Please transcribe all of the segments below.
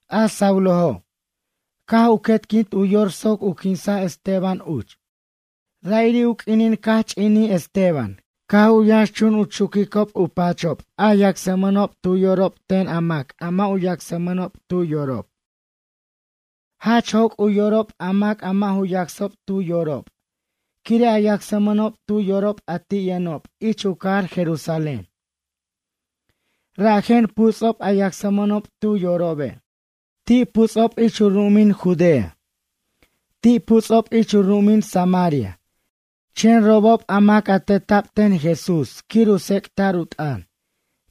A Saulojo', caj u quetquint u yor soc u quinsa' Esteban uch. Ra'iri' u q'uinin caj ch'inij Esteban caj u yʌnxchun u chuquicob u pachob a yacsmʌnob tu yorob ten a mac a mʌ' yacsmʌnob tu yorob. Jach joc' u yorob a mac a mʌ' ju yacsob tu yorob quire' a yacsmʌnob tu yorob a ti' yʌnob ich u cajar Jerusalén. Rajen puts'ob a yacsmʌnob tu yorobe'. Ti' puts'ob ich u ru'umin Judea. Ti' puts'ob ich u ru'umin Samaria, chen robob a mac teta'b ten Jesús quir u tsec'ta'r u t'ʌn,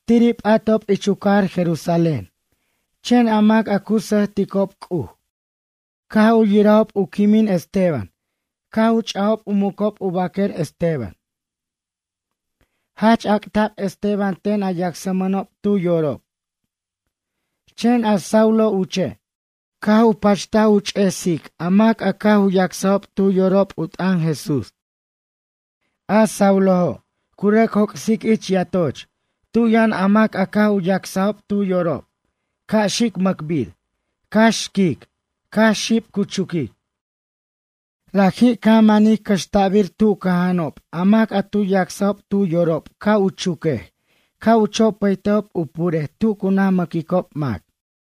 tiri' p'atob ich u cajar Jerusalén. Chen a mac a cu sʌjticob C'uj, caj u yirajob quimij Esteban caj u ch'ajob u mucob u baquer Esteban. Jach ac'ta'b Esteban ten a yacsmʌnob tu yorob. Chen a Saulo uche', caj u pachtaj u ch'esic a mac a caj u yacsajob tu yorob u t'ʌn Jesús. A Saulo', cu rʌc joc'sic ich yatoch tu yʌn a mac a caj u yacsajob tu yorob ca' xic mʌcbir, cax xquic, cax xib cu chuquic. Raji' caj manij cʌxta'bir tu cʌja'anob a mac a tu yacsajob tu yorob ca' u chuquej, ca' u chopʌytejob u purej tu cu naj mʌquicob mac.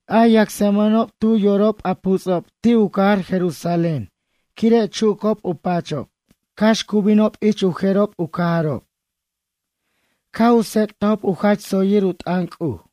A yacsmʌnob tu yorob, a puts'ob ti' u cajar Jerusalén, quire' chucob u pachob, cax tu binob ich u jerob u cajarob, caj u tsec'tajob u jach tsoyir u t'ʌn C'uj.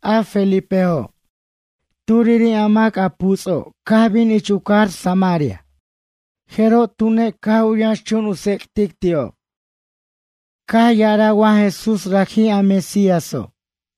A Felipejo', turiri' a mac a puts'o', caj bin ich u cajar Samaria, jeroj tune', caj u yʌnxchun u tsec'tic ti'ob, caj ya'araj wa Jesús, raji' a Mesíaso'.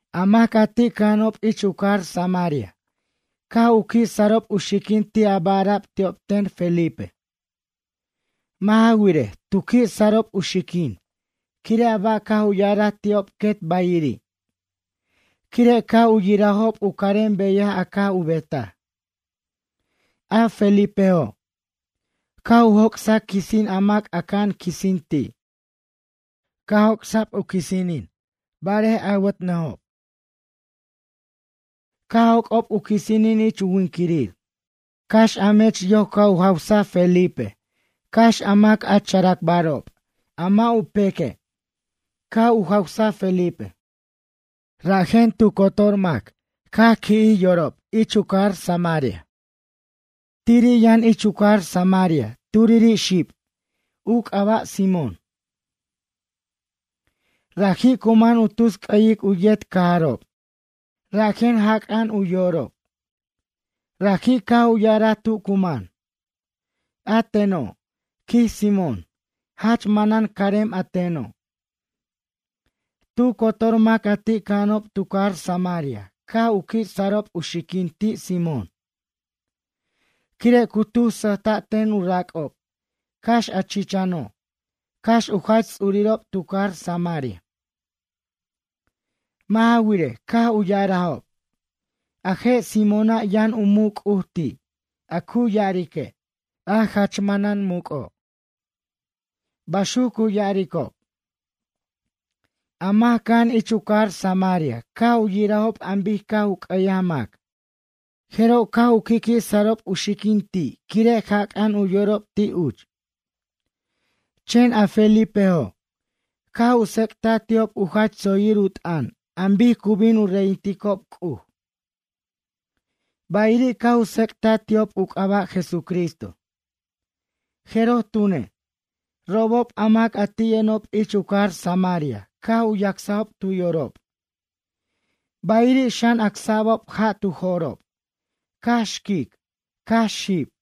A mac a ti' cʌja'anob ich u cajar Samaria, caj u qui' sarob u xiquin ti' a ba' ara'b ti'ob ten Felipe. Mʌ' ja wirej, tu qui' sarob u xiquin, quire' a ba' caj u ya'araj ti'ob quet bayiri', quire' caj u yirajob u carem beyaj a caj u betaj. A Felipejo', caj u joc'saj quisin, a mac aca'an quisin ti'. Caj joc'sa'b u quisinin barej awatnʌjob, caj joc'ob u quisinin ich u winquirir. Cax a mech yoc caj u jawsaj Felipe, cax a mac a characbarob, a mʌ' u peque', caj u jawsaj Felipe. Rajen tu cotor mac caj qui'jij yorob ich u cajar Samaria. Tiri' yʌn ich u cajar Samaria, turiri' xib, u c'aba' Simón. Raji' cu man u tus c'ʌyic u yet cajarob, rajen jac'a'an u yorob. Raji' caj u ya'araj tu cu man: ―A teno' ―quij Simón―, jach manan caremen a teno'. Tu cotor mac a ti' cʌja'anob tu cajar Samaria caj u qui' sarob u xiquin ti' Simón, quire' cu tus sʌjta' ten u rac'ob, cax a chichano', cax u jach ts'urirob tu cajar Samaria. Mʌ' ja wirej, caj u ya'arajob: ―A je' Simóna', yʌn u muc' C'uj ti', a cu ya'arique': A Jach Manan Muc'o' ―baxuc cu ya'aricob. A mac cʌja'an ich u cajar Samaria caj u yirajob an bic caj u c'ʌyaj mac, jeroj caj u qui'qui' sarob u xiquin ti', quire' jac'a'an u yorob ti' uch. Chen a Felipejo' caj u tsec'taj ti'ob u jach tsoyir u t'ʌn an bic cu bin u reyinticob C'uj, bayiri' caj u tsec'taj ti'ob u c'aba' Jesucristo. Jeroj tune', robob a mac a ti' yʌnob ich u cajar Samaria caj u yacsjob tu yorob, bayiri' xan, acsa'bob ja' tu jo'rob, cax xquic, cax xib.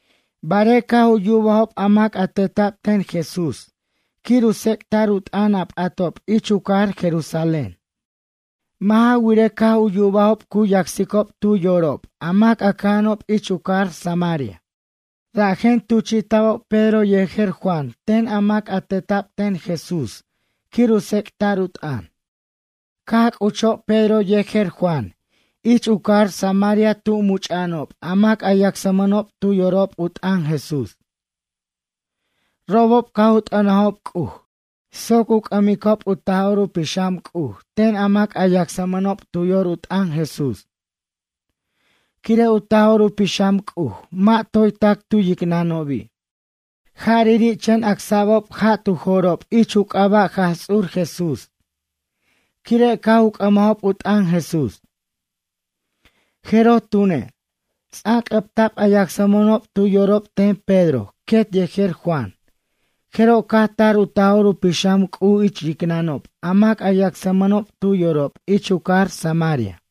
Barej caj u yubajob a mac a teta'b ten Jesús quir u tsec'ta'r u t'ʌn a p'atob ich u cajar Jerusalén. Mʌ' ja wirej, caj u yubajob cu yacsicob tu yorob a mac a cʌja'anob ich u cajar Samaria. Rajen tuchi'ta'bob Pedro yejer Juan ten a mac a teta'b ten Jesús quir u tsec'ta'r u t'ʌn. Caj c'uchob Pedro yejer Juan ich u cajar Samaria tu much'a'anob a mac a yacsmʌnob tu yorob u t'ʌn Jesús. Robob caj u t'ʌnajob C'uj soc u c'ʌmbicob u Taj'or u Pixam C'uj ten a mac a yacsmʌnob tu yor u t'ʌn Jesús. Quire' u Taj'or u Pixam C'uj mʌ' toy tac tu yicnʌnobi'. Jarari' chen acsa'bob ja' tu jo'rob ich u c'aba' Jaj Ts'ur Jesús, quire' caj u c'ʌmajob u t'ʌn Jesús. Jeroj tune', ts'anc'ʌbta'b a yacsmʌnob tu yorob ten Pedro quet yejer Juan, jeroj caj tar u Taj'or u Pixam C'uj ich yicnʌnob a mac a yacsmʌnob tu yorob ich u cajar Samaria.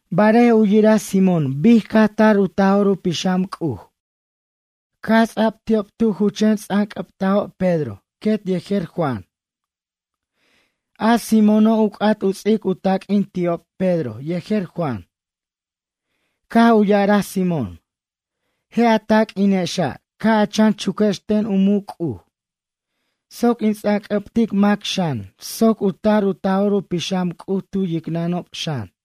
Barej u yiraj Simón bic caj tar u Taj'or u Pixam C'uj caj ts'a'b ti'ob tu ju chen ts'anc'ʌbtajob Pedro quet yejer Juan. A Simóno', u c'at u ts'ic u taq'uin ti'ob, Pedro yejer Juan. Caj u ya'araj Simón: ―Je' a taq'uinexa', ca' a chan chuquex ten u muc' C'uj soc in ts'anc'ʌbtic mac xan, soc u tar u Taj'or u Pixam C'uj tu yicnʌnob xan.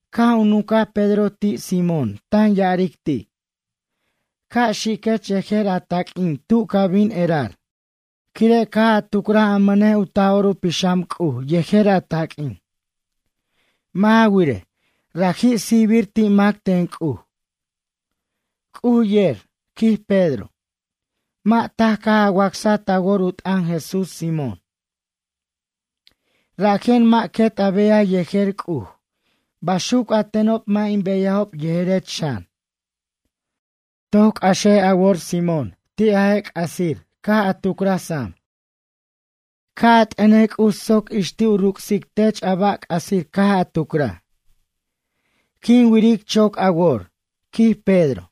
Caj u nuncaj Pedro ti' Simón tan ya'aric ti': ―Ca' xiquech yejer a taq'uin tu ca bin erar, quire' caj a tucraj a mʌnej u Taj'or u Pixam C'uj yejer a taq'uin. Mʌ' ja wirej, raji' sijbir ti' mac ten C'uj. C'uj yer ―quij Pedro―, mʌ' taj caj a wacsaj ta wor u t'ʌn Jesús, Simón. Rajen mʌ' quet a beyaj yejer C'uj, baxuc a tenob, mʌ' in beyajob yejerech xan. Toc c'axej a wor Simón ti' a je' c'asir caj a tucraj sam. Ca' a t'ʌnej C'uj soc ix ti' u ruc'sic tech a ba' c'asir caj a tucraj. Quin wiric choc a wor ―quij Pedro―,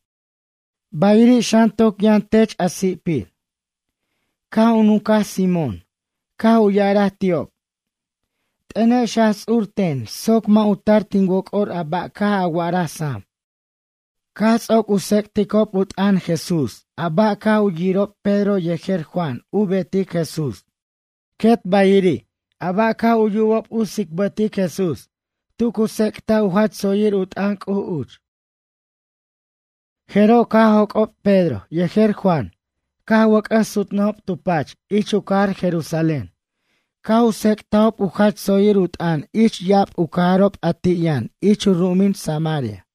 bayiri' xan toc yʌn tech a si'pir. Caj u nuncaj Simón, caj u ya'araj ti'ob: ―T'ʌnex Jaj Ts'ur ten soc mʌ' u tar tin woc'or a ba' caj a wa'ara sam. Caj ts'oc u tsec'ticob u t'ʌn Jesús a ba' caj u yirob, Pedro yejer Juan u betic Jesús, quet bayiri' a ba' caj u yirob tu tsicbataj Jesús tu cu tsec'taj u jach tsoyir u t'ʌn C'uj uch. Jeroj caj joc'ob Pedro yejer Juan caj u wʌc'ʌs sutnʌjob tu pach ich u cajar Jerusalén caj u tsec'tajob u jach tsoyir u t'ʌn ich ya'ab u cajarob a ti' yʌn ich u ru'umin Samaria.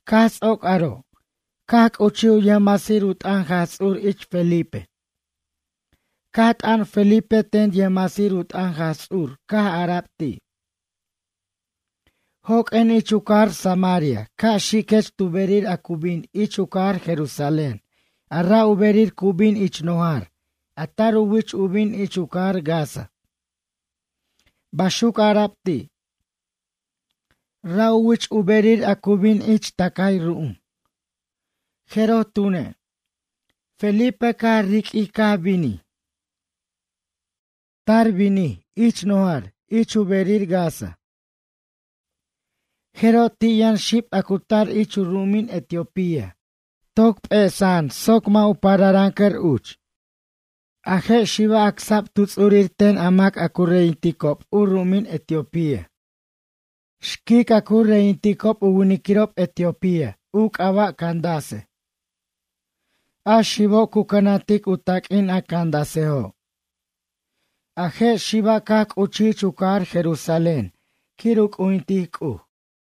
Caj ts'oc aro', caj c'uchij u yʌjmasir u t'ʌn Jaj Ts'ur ich Felipe, caj t'an Felipe ten yʌjmasir u t'ʌn Jaj Ts'ur, caj ara'b ti': ―Joq'uen ich u cajar Samaria ca' xiquech tu berir a cu bin ich u cajar Jerusalén a ra' u berir cu bin ich nojar a tar u wich u bin ich u cajar Gaza ―baxuc ara'b ti'. Ra' u wich u berir a cu bin ich tʌcay ru'um. Jeroj tune', Felipe caj riq'uij caj binij. Tar binij ich nojar ich u berir Gaza. Jeroj ti' yʌn xib a cu tar ich u ru'umin Etiopía, toc p'esa'an soc mʌ' u pararʌncʌr uch. A je' xiba' acsa'b tu ts'urir ten a mac a cu reyinticob u ru'umin Etiopía, xquic a cu reyinticob u winiquirob etiopía, u c'aba' Candace. A xibo' cu cʌnantic u taq'uin a Candacejo'. A je' xiba' caj c'uchij ich u cajar Jerusalén quir u c'ujintic C'uj.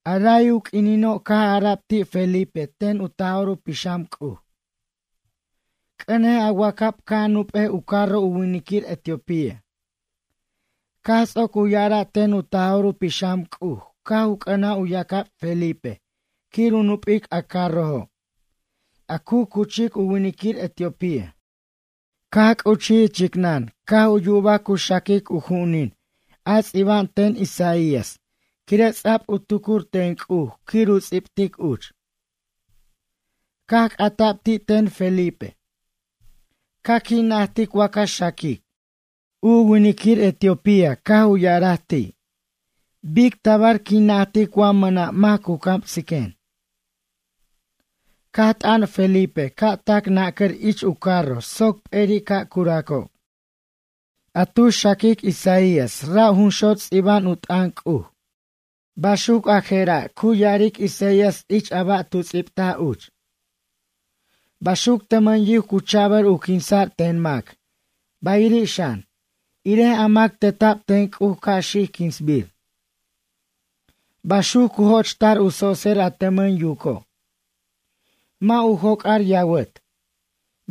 A ray u q'uinino', caj ara'b ti' Felipe ten u Taj'or u Pixam C'uj: ―C'ʌnej a wacab ca' a nup'ej u carro u winiquir etiopía. Caj ts'oc u ya'ara' ten u Taj'or u Pixam C'uj, caj u c'ʌnaj u yacab Felipe quir u nup'ic a carrojo' a cu cuchic u winiquir etiopía. Caj c'uchij ich yicnʌn caj u yubaj cu xaquic u ju'unin a ts'iba'an ten Isaías quire' ts'a'b u tucur ten C'uj quir u ts'ibtic uch. Caj c'ata'b ti' ten Felipe: ―Ca qui' najtic wa ca xaquic? U winiquir etiopía caj u ya'araj ti': ―Bic tabar quin najtic wa mʌna' mac cu camsiquen? Caj t'ʌn Felipe ca' tac nacʌr ich u carro soc p'eri' ca' curacob. A tu xaquic Isaías, ra' jun xot' ts'iba'an u t'ʌn C'uj. Baxuc a jera', cu ya'aric Isaías ich a ba' tu ts'ibtaj uch: Baxuc tʌmʌn yuc cu cha'bʌr u quinsa'r ten mac, bayiri' xan, irej a mac a teta'b ten C'uj ca' xic quinsbir. Baxuc cu joch'ta'r u tso'tser a tʌmʌn yuco', mʌ' u joc'ar yawʌt,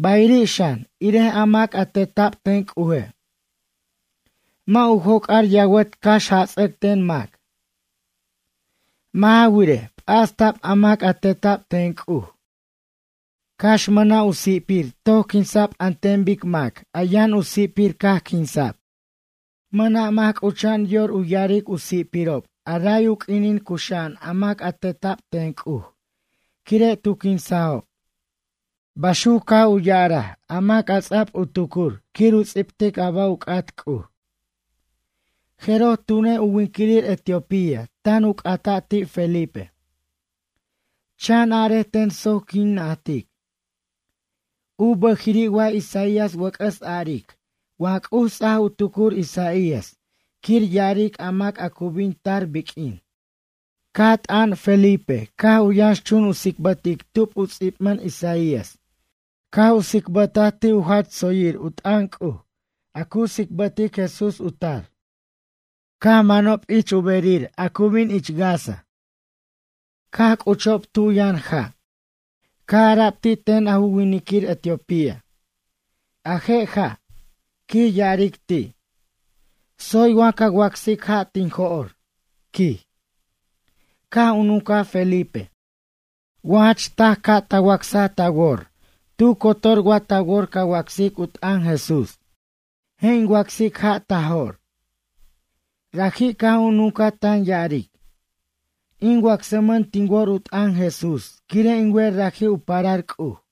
bayiri' xan, irej a mac a teta'b ten C'uje', mʌ' u joc'ar yawʌt cax jats'ʌc ten mac. Mʌ' ja wirej, p'asta'b a mac a teta'b ten C'uj, cax mʌna' u si'pir toc quinsa'b an ten bic mac a yʌn u si'pir caj quinsa'b. Mʌna' mac c'ucha'an yor ya'aric u si'pirob a ray u q'uinin cuxa'an a mac a teta'b ten C'uj quire' tu quinsajob. Baxuc caj u ya'araj a mac a ts'a'b u tucur quir u ts'ibtic a ba' u c'at C'uj. Jeroj tune', u winiquir etiopía tan u c'ata' ti' Felipe: ―Chan arej ten soc quin najtic. U bʌjiri' wa Isaías wʌc'ʌs aric, wa C'uj ts'aj u tucur Isaías quir ya'aric a mac cu bin tar biq'uin? Caj t'an Felipe, caj u yʌnxchun u tsicbʌtic tub u ts'ibmʌn Isaías, caj u tsibʌtaj ti' u jach tsoyir u t'ʌn C'uj a cu tsicbʌtic Jesús u tar. Caj u manob ich bej, u berir a cu bin Gaza, caj c'uchob tu yʌn ja'. Caj ara'b ti' ten a ju winiquir etiopía: ―A je' ja' ―quij ya'aric ti'―. Tsoy wa ca wacsic ja' tin jo'r? ―quij. Caj u nuncaj Felipe: ―Wa jach taj caj ta wacsaj ta wor, tu cotor wa ta wor ca wacsic u t'ʌn Jesús. Je' in wacsic ja' ta jo'r. Raji' caj u nuncaj tan ya'aric: ―In wacsmʌn tin wor u t'ʌn Jesús, quire' in wer raji' u parar C'uj.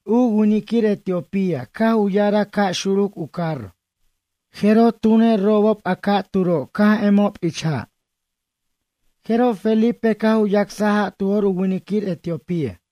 U winiquir etiopía caj u ya'araj ca' xuruc u carro, jeroj tune', robob a ca'turo' caj emob ich ja'. Jeroj Felipe caj u yacsaj ja' tu jo'r u winiquir etiopía.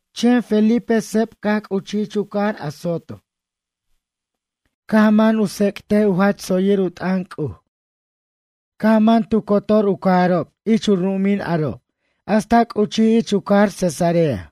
Chen Felipe seb caj c'uchij ich u cajar Azoto. Caj u man u tsec'tic u jach tsoyir u t'ʌn C'uj. Caj u man tu cotor u cajarob ich u ru'umin aro' hasta c'uchij ich u cajar Cesarea.